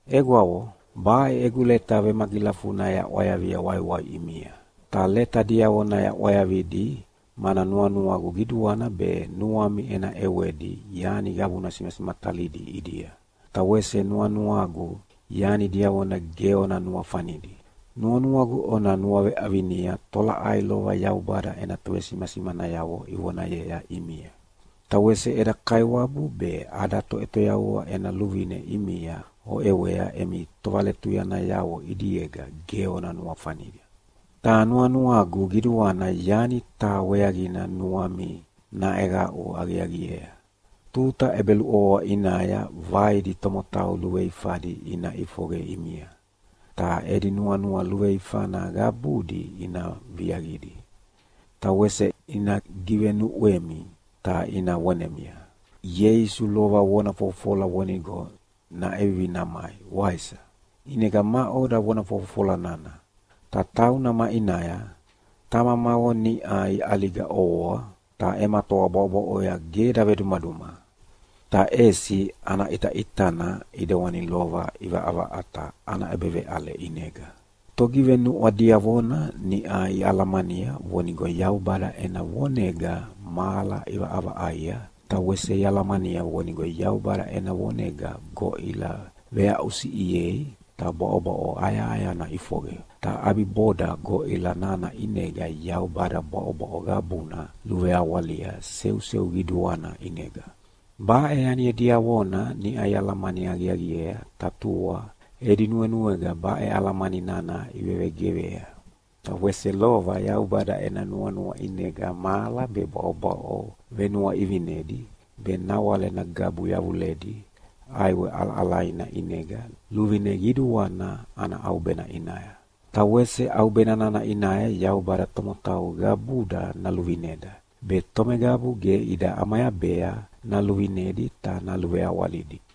Egwavo, baʼe egu leta vemagilafuna yaʼwayavia waiwai ʼimia. Ta leta diavona yaʼwayavidi mana nuanuagu qiduana be nuami ena ʼewedi yani qabuna simasimatalidi ʼidia, ta wese nuanuagu yani diavona ge ona nuafanidi. Nuanuagu ona nuaveʼavinia tolaʼai lova Yaubada ena tovesimasimanayavo ivonayea ʼimia. Ta wese eda Kaiwabu be ada Toʼetoyavua ena luvine ʼimia oʼewea emi tovaletuyanayavo ʼidiega ge ona nuafania. Ta nuanuagu qiduana yani taha weaqina nuami naʼeqaʼu aqiaqiea. Tuta ʼebeluʼovoa ʼinaya vaidi tomotau luveifadi ina ʼifoqe ʼimia, ta edi nuanua luveifana qabudi ina viaqidi. Ta wese ina givenuʼwemi ta ina vonemia, “Ieisu lova vona fofofola vonigo naʼevivi namai, waisa? ʼInega maʼoda vona fofofola nana, ta tauna maʼinaya? Tamamavo niʼa iʼaliga ʼovoa, ta ema toa bwaʼobwaʼoya ge davedumaduma, ta ʼesi ana ʼitaʼitana ʼidewani lova ʼivaʼavaʼata ana ʼebeveʼale ʼinega.” Togivenuʼwa diavona niʼa ialamania vonigo Yaubada ena vonega mahala ʼivaʼavaʼaia, ta wese ialamania vonigo Yaubada ena vonega goʼila veaʼusiʼiei ta bwaʼobwaʼo ayahayana ʼifoqe. Ta ʼabiboda goʼila nana ʼinega Yaubada bwaʼobwaʼo qabuna luveawalia seuseu qiduana ʼinega. Baʼe yani diavona niʼa ialamani aqiaqiea ta tua, edi nuenuega baʼe alamani nana ivevegeqea. Ta wese lova Yaubada ena nuanua ʼinega mahala be bwaʼobwaʼo venuaʼivinedi be nawale nagabu yavuledi ʼaiwe ʼalaʼalaina ʼinega luvine qiduana ana ʼaubena ʼinaya. Ta wese ʼaubena nana ʼinaya Yaubada tomotau qabuda naluvineda, be tomeqabu ge ida ʼamayabea naluvinedi ta naluveawalidi.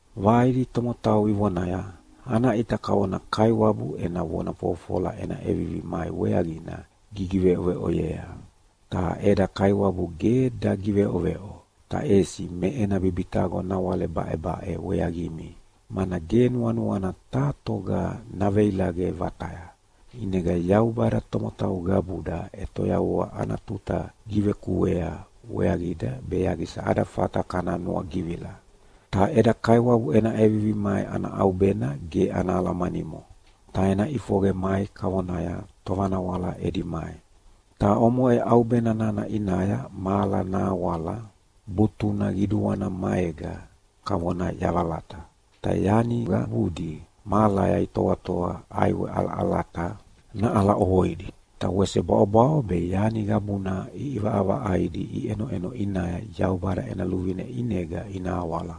Vaidi tomotau ivonaya, “Ana ʼita kavona Kaiwabu ena vona fofofola ena ʼevivi mai weaqina gigiveʼoveʼoyea!” Ta eda Kaiwabu ge dagiveʼoveʼo, ta ʼesi me ena bibitaqo nawale baʼebaʼe weaqimi, mana ge nuanuana taha toga naveilaqe vataya. ʼInega Yaubada tomotau qabuda ʼetoyavua ana tuta givekuea weaqida be yaqisa ada fata kana nuagivila. Ta eda Kaiwabu ena ʼevivi mai ana ʼaubena ge ana alamanimo, ta ena ʼifoqe mai kavonaya tovanawala edi mai. Ta omoʼe ʼaubena nana ʼinaya mahala nahawala butuna qiduana maega kavona yavalata. Ta yani qabudi mahalaya itoatoa ʼaiwe ʼalaʼalata naʼala ʼovoidi. Ta wese bwaʼobwaʼo be yani qabuna ʼivaʼavaʼaidi iʼenoʼeno ʼinaya Yaubada ena luvine ʼinega ina awala.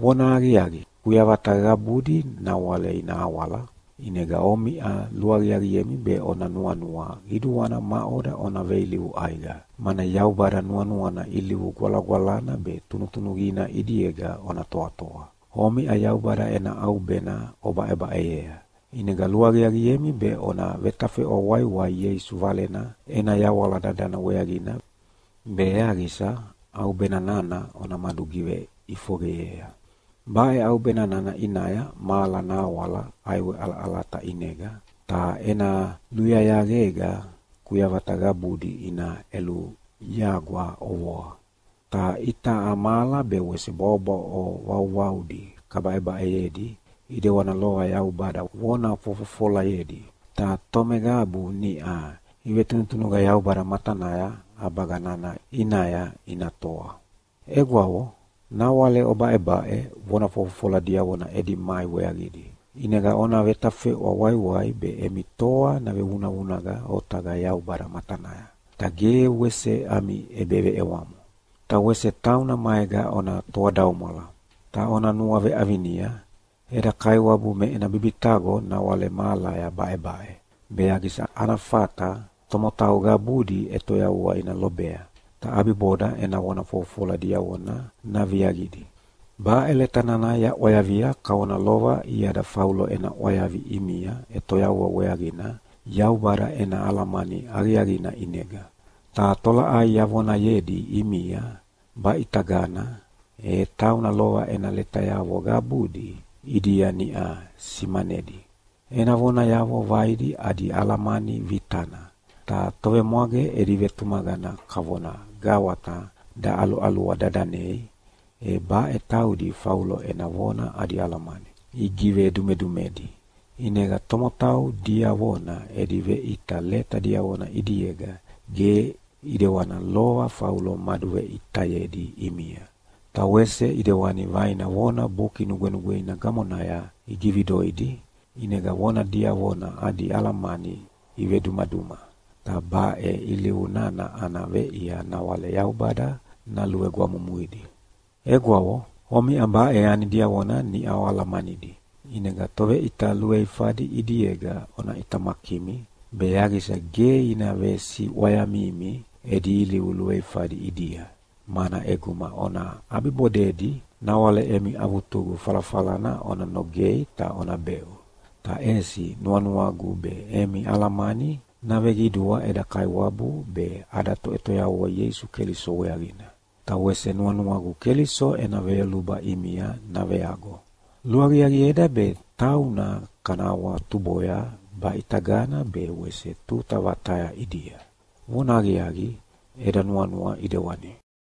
Vonahaqiaqi, kuyavata qabudi nawale ina awala, ʼinega omiʼa luaqiaqiemi be ona nuanua qiduana maʼoda ona veilivu ʼaiqa, mana Yaubada nuanuana ilivu gwalagwalana be tunutunuqina ʼidiega ona toatoa. Omiʼa Yaubada ena ʼaubena obaʼebaʼeyea, ʼinega luaqiaqiemi be ona vetafeʼwa waiwai Ieisu Valena ena yawala dadana weaqina be yaqisa ʼaubena nana ona madugiveʼifoqeyea. Baʼe ʼaubena nana ʼinaya mahala nahawala ʼaiwe ʼalaʼalata ʼinega, ta ena luyayaqega kuyavata qabudi ina ʼeluyagwa ʼovoa. Ta itaʼa mahala be wese bwaʼobwaʼo vauvaudi kabaʼebaʼeyedi, ʼidewana lova Yaubada vona fofofolayedi. Ta tomeqabu niʼa ivetunutunuqa Yaubada matanaya ʼabaga nana ʼinaya ina toa. Egwavo, nawale obaʼebaʼe vona fofofola diavona edi mai weaqidi. ʼInega ona vetafeʼwa waiwai be emi toa navevunavunaqa otaqa Yaubada matanaya, ta ge wese ami ʼebeveʼewamo. Ta wese tauna maega ona toadaumwala. Ta ona nuaveʼavinia, eda Kaiwabu me ena bibitaqo nawale mahalaya baʼebaʼe, be yaqisa ana fata tomotau qabudi ʼetoyavua ina lobea, ta ʼabiboda ena vona fofofola diavona naviaqidi. Baʼe leta nana yaʼwayavia kavona lova iada Faulo ena ʼwayavi ʼimia ʼetoyavua weaqina Yaubada ena alamani aqiaqina ʼinega. Ta tolaʼai yavonayedi ʼimia baʼitagana, e tauna lova ena letayavo qabudi ʼidia niʼa simanedi. Ena vonayavo vaidi adi alamani vitana. Ta tovemwage edi vetumaqana kavona gawata daʼaluʼalua dadanei, e baʼe taudi Faulo ena vona adi alamani igivedumedumedi. ʼInega tomotau diavona edi veʼita leta diavona ʼidiega ge ʼidewana lova Faulo maduveʼitayedi ʼimia. Ta wese ʼidewani vaina vona Buki Nugwenugweina gamonaya igividoidi ʼinega vona diavona adi alamani ivedumaduma, ta baʼe ilivu nana ana veʼia nawale Yaubada naluvegwamumuidi. Egwavo, omiʼa baʼe yani diavona niʼa oalamanidi, ʼinega toveʼita luveifadi ʼidiega ona ʼitamakimi, be yaqisa ge ina vesiʼwayamimi edi ilivu luveifadi ʼidia. Mana ʼeguma ona ʼabibodedi nawale emi avutugu falafalana ona nogei ta ona beʼu. Ta ʼesi nuanuagu be emi alamani naveqidua eda Kaiwabu be ada Toʼetoyavua Ieisu Keliso weaqina. Ta wese nuanuagu Keliso ena veyoluba ʼimia naveago. Luaqiaqieda be tauna kana awahawatuboya baʼitagana be wese tuta vataya ʼidia. Vonahaqiaqi, eda nuanua ʼidewani.